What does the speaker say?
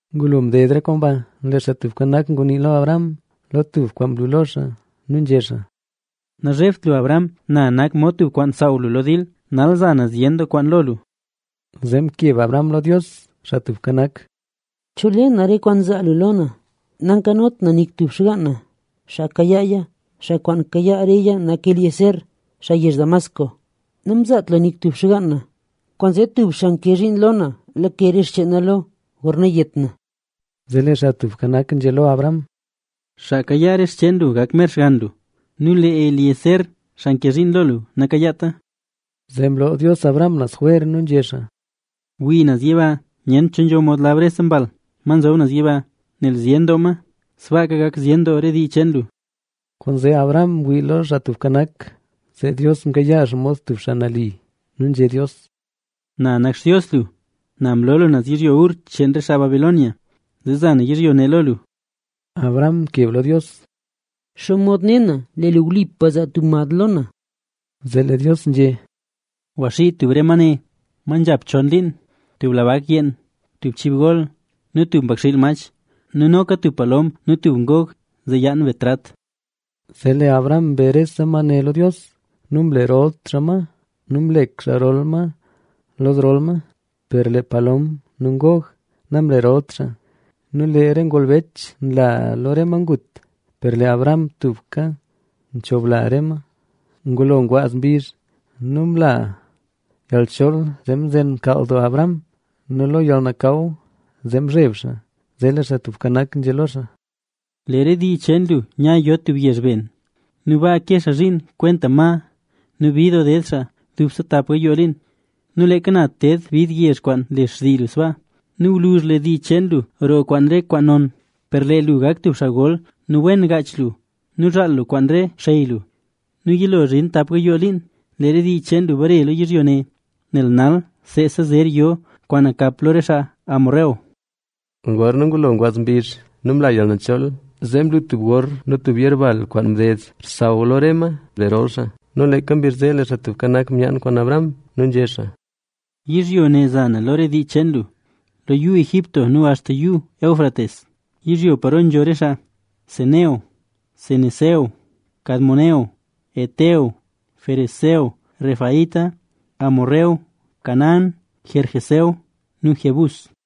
Ngulo mded re kwaan ba, lee Xaa Tubka Nak ngunii lo Abram lo tub kwaan mlu lo xaa nu nzhé xaa: —Nazhebt lu Abram. Na nak mod tub kwaan saaw lu lo dil; nal za na zyen doo kwaan lo lu. Zee mkeb Abram lo Dios, Xaa Tubka Nak: —¿Cho le na re kwaan zaa lu lo na? Nankanot na nik tub xgaan na, xaa kayaaya. Xaa kwaan kayaa reya nak Eliezer, xaa yezh Damasco. Nu nzhé Abram: —Namzaat lu nik tub xgaan na, kwaanzee tub xaa nke zhiin lo na lake re xcheen na lo, gorna yet na. Zee lee Xaa Tubka Nak nzhé lo Abram: —Xaa kayaa re xcheen lu gak mer xgann lu nu lee Eliezer, xaa nke zhiin lo lu, nakayaata. Zee mloo Dios Abram naz jwer nu nzhé xaa: —Wii naz yiba. Nyent cho nzho mod lab rese mbal, ma nzob naz yiba, nel zyen doo ma. Sbaaka gak zyen doo re dii cheen lu. Kwaanzee Abram mwii lo Xaa Tubka Nak, zee Dios mkayaa xaa mod tub xaa nali. Nu nzhé Dios: —Na nak Xtios lu, na mlo lu naz yizhyo Ur cheen xaa Caldea, zee za na yizhyo ne lo lu. Abram mkeb lo Dios: —¿Xomod ne na, lee lu wlipa zaa lu tub mad lo na? Zee lee Dios nzhé: —Gwaxii tub re ma ne, ma nzhap chon liin: tub la bak yeen, tub chib gol nu tub mbakxiil mach nu noka tub palom nu tub ngog zee yaan be trat. Zee lee Abram mbe rese ma ne lo Dios nu mlerol xaa ma nu mlek xaa rol ma lo zrol ma, per lee palom nu ngog namlerolt xaa. Nu lee re ngolbech nla lo re ma ngut, per lee Abram tubka nchobla ma. Ngulo ngwaaz mbizh nu mla yalchool, zee mzen mkaal doo Abram. Nu lo yalnakaw zee mzheb xaa. Zee lee Xaa Tubka Nak nzhé lo xaa: —Lee re dii cheen lu nya yo tub yezh ben nu baa ke xaa zhiin kwenta ma nu bid doo ded xaa dubse tap gayoo liin. Nu leeka na ted bid yezh kwaan le xtii lu sbaa. Nu gwluzh lee dii cheen lu roo kwaan re kwaan non. Per lee lu gak lu tub xaa gol nu wen gaach lu nu zhaal lu kwaan re xey lu. Nu yilo zhin tap gayoo liin, lee re dii cheen lu bare lo yizhyo ne, nel nal seesa zer yo kwaan nakap lo re xaa Hesbón. Gorna ngulo ngwaaz mbizh nu mla yalnachol, zee mlu tub gor nu tub yerbal kwaan mded xsaw lo re ma mlerol xaa. Nu leeka mbizh zee lee Xaa Tubka Nak myaan kwaan Abram nu nzhé xaa: —Yizhyo ne za na lo re dii cheen lu, lo Yuu Egipto nu axta lo Yuu Éufrates, yizhyo paro nzho re xaa: Ceneo, Cenezeo, Cadmoneo, Het, Ferezeo, Refaíta, Amorreo, Canaán, Gergeseo nu Jebús.